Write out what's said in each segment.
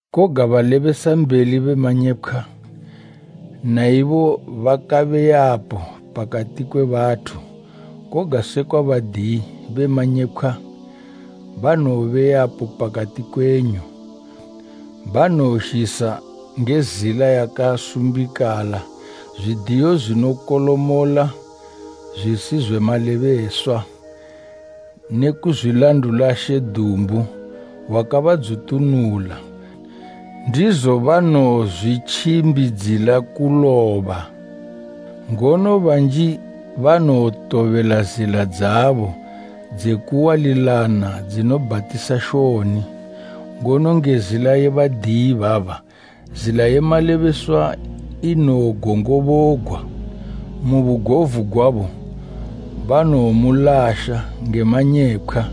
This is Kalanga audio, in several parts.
Koga balebesambeli be manyepkhwa na ibo bakabe yapo pakati kwe bathu, koga sekwa badiyi be manyepkhwa banowobe yapo pakati kwenyu, banowozhisa nge zila yakasumbikala zwidiyo zwinokolomola zwisizwe malebeswa, ne kuzwilandula She dumbu wakabadzutunula, ndizo banowozwitjimbidzila kuloba. Ngono banji banowotobela zila dzabo dze kuwalilana dzinobhatisa shoni, ngono nge zila ye badiyi ibaba, zila ye malebeswa inowogongobogwa. Mu bugovu gwabo, banowomulasha nge manyepkhwa,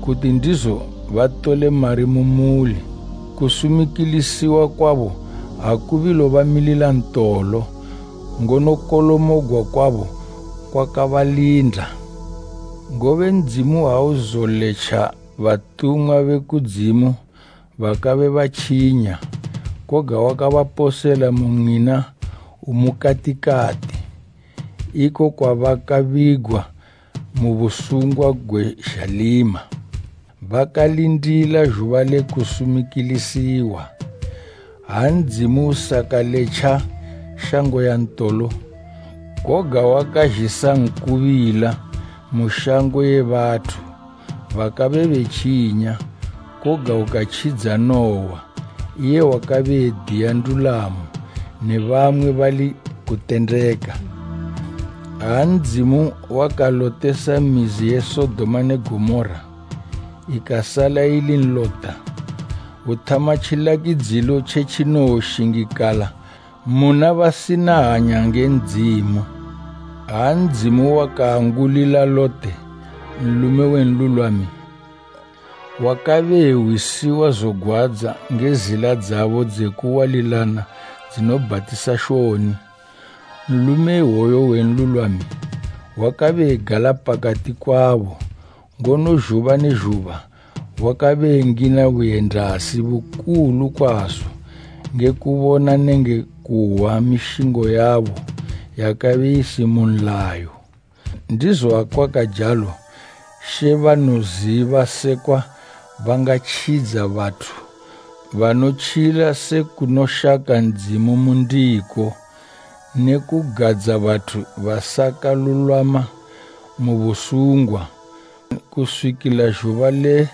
kuti ndizo batole mari mu muli. Kusumikilisiwa kwabo akubilobamilila ntolo, ngono kolomogwa kwabo kwakabalinda. Ngobe Ndzimu auzoletja batumwa be kudzimu bakabe batjinya, koga wakabaposela mu mwina umukatikati, iko kwabakabigwa busungwa gwe zhalima, bakalindila zhuba le kusumikilisiwa; —7:24ha Ndzimu usakaletja shango ya ntolo, koga wakazhisa nkubila mu shango ye bathu bakabe betjinya, koga ukatjidza Nuwa, iye wakabe ediya ndulamo, ne bamwe bali kutendeka. Ha Ndzimu wakalotesa mizi ye Sodoma ne Gomora, ikasala ili nlota, uthama tjilakidzilo tje tjinowoshingikala muna basina hanya nge Ndzimu. Ha Ndzimu wakaangulila Lote, nlume we nlulwami, wakabe ehwisiwa zogwadza nge zila dzabo dze kuwalilana dzinobhatisa shoni, nlume iwoyo we nlulwami, wakabe egala pakati kwabo, ngono zhuba ne zhuba wakabe engina buyendasi bukulu kwazo nge kubona nenge kuhwa mishingo yabo yakabe isi mu nlayo. Ndizo akwakajalo She banoziba sekwa bangatjidza bathu banotjila se kunoshaka Ndzimu mu ndiko, ne kugadza bathu basakalulwama mu busungwa, kuswikila zhuba le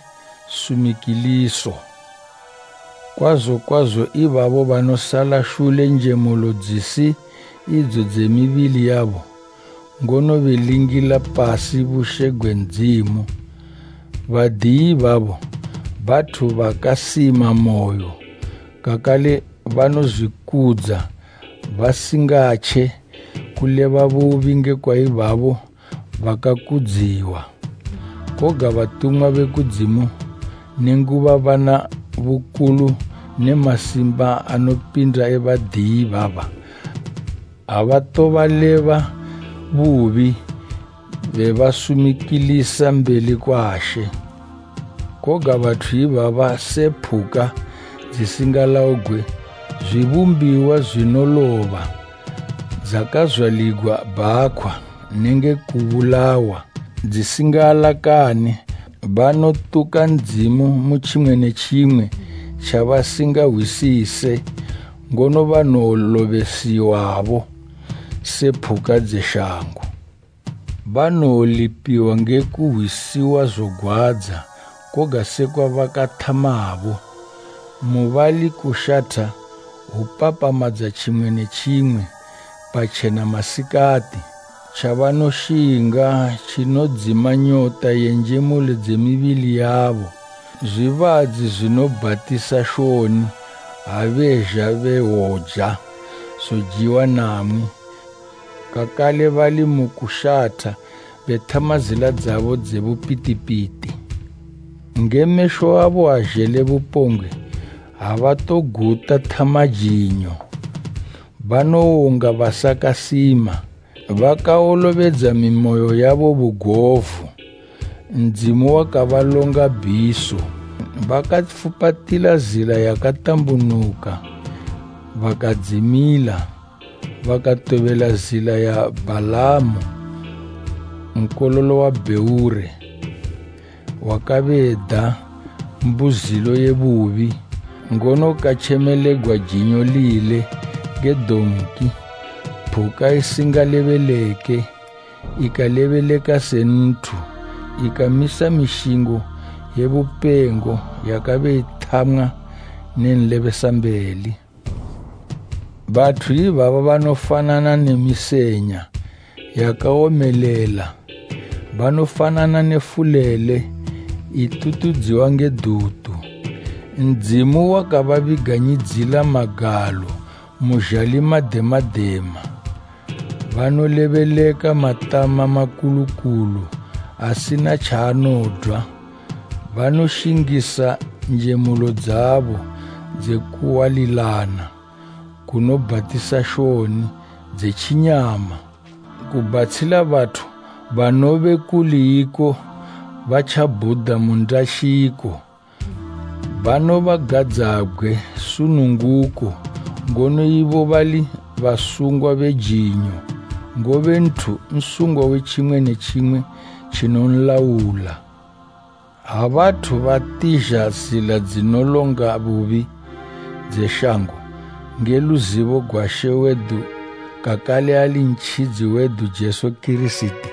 sumikiliso, kwazo kwazo ibabo banosala shule njemulo dzisi idzo dze mibili yabo, ngono belingila pasi bushe gwe Ndzimu. Badiyi ibabo, bathu bakasima moyo, kakale banozwikudza basingatje kuleba bubi ngekwa ibabo bakakudziwa. Koga batumwa be kudzimu, nenguba bana bukulu ne masimba anopinda e badiyi ibaba, abatobaleba bubi bebasumikilisa mbeli kwa She. Koga bathu ibaba se phuka dzisingalaugwe, zwibumbiwa zwinoloba dzakazwaligwa bhakhwa nenge kubulawa, dzisingaalakane, banotuka Ndzimu mu tjimwe ne tjimwe tjabasingahwisise. Ngono banowolobesiwabo se phuka dze shango. Banowolipiwa nge kuhwisiwa zogwadza koga sekwa bakathamabo. Mu bali kushatha hwupapamadza tjimwe ne tjimwe patjena masikati, tjabanoshinga tjinodzima nyota ye njemulo dze mibili yabo; zwibadzi zwinobhatisa shoni ha bezha bewoja zojiwa namwi, kakale bali mu kushatha, bethama zila dzabo dze bupitipiti. Nge mesho abo azhele bupongwe habatoguta thama jinyo. Banowonga basakasima. Bakawolobedza mimoyo yabo bugovu. Ndzimu wakabalonga bhiso! Bakafupatila zila yakatambunuka bakadzimila, bakatobela zila ya Bhalamu nkololo wa Bheore, wakabe eda mbuzilo ye bubi, ngono katjemelegwa jinyo lile nge donki, phuka isingalebeleke ikalebeleka se nthu, ikamisa mishingo ye bupengo yakabe ithamwa ne nlebesambeli. Bathu ibaba banofanana ne misenya yakawomelela, banofanana ne fulele itutudziwa nge dutu; Ndzimu wakababiganyidzila magalo mu zhalima dema dema. Banolebeleka matama makulu kulu asina tjaanodwa, banoshingisa njemulo dzabo dze kuwalilana kunobhatisa shoni dze tjinyama, kubhatshila bathu banobe kuli iko batjabhuda mu ndashiko. Banobagadzabgwe sununguko, ngono ibo bali basungwa be jinyo; ngobe nthu nsungwa we tjimwe ne tjimwe tjinonlaula. Ha bathu batizha zila dzinolonga bubi, dze shango, nge luzibo gwa She wedu kakale ali Ntjidzi wedu Jesu Kirisiti,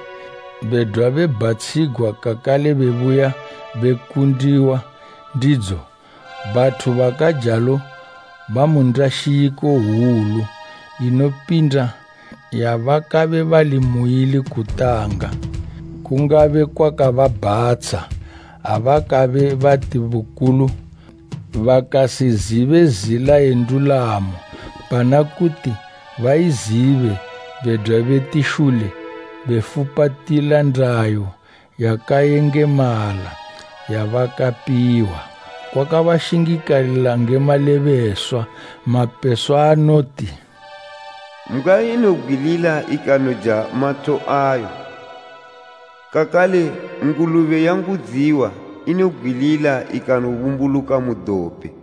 bedwa bebhatshigwa kakale bebuya bekundiwa ndidzo, bathu bakajalo bamu ndashiko hwulu inopinda yabakabe bali muili kutanga. Kungabe kwakababhatsha, abakabe bati bukulu bakasizibe zila ye ndulamo pana kuti baizibe bedwa beti shule befupatila ndayo yakayengemala yabakapiwa. Kwakabashingikalila nge malebeswa mapeswa anoti, “Mbgwa inobgwilila ikanoja matho ayo” kakale “Ngulube yaangudziwa inobgwilila ikanobumbuluka mu dope.”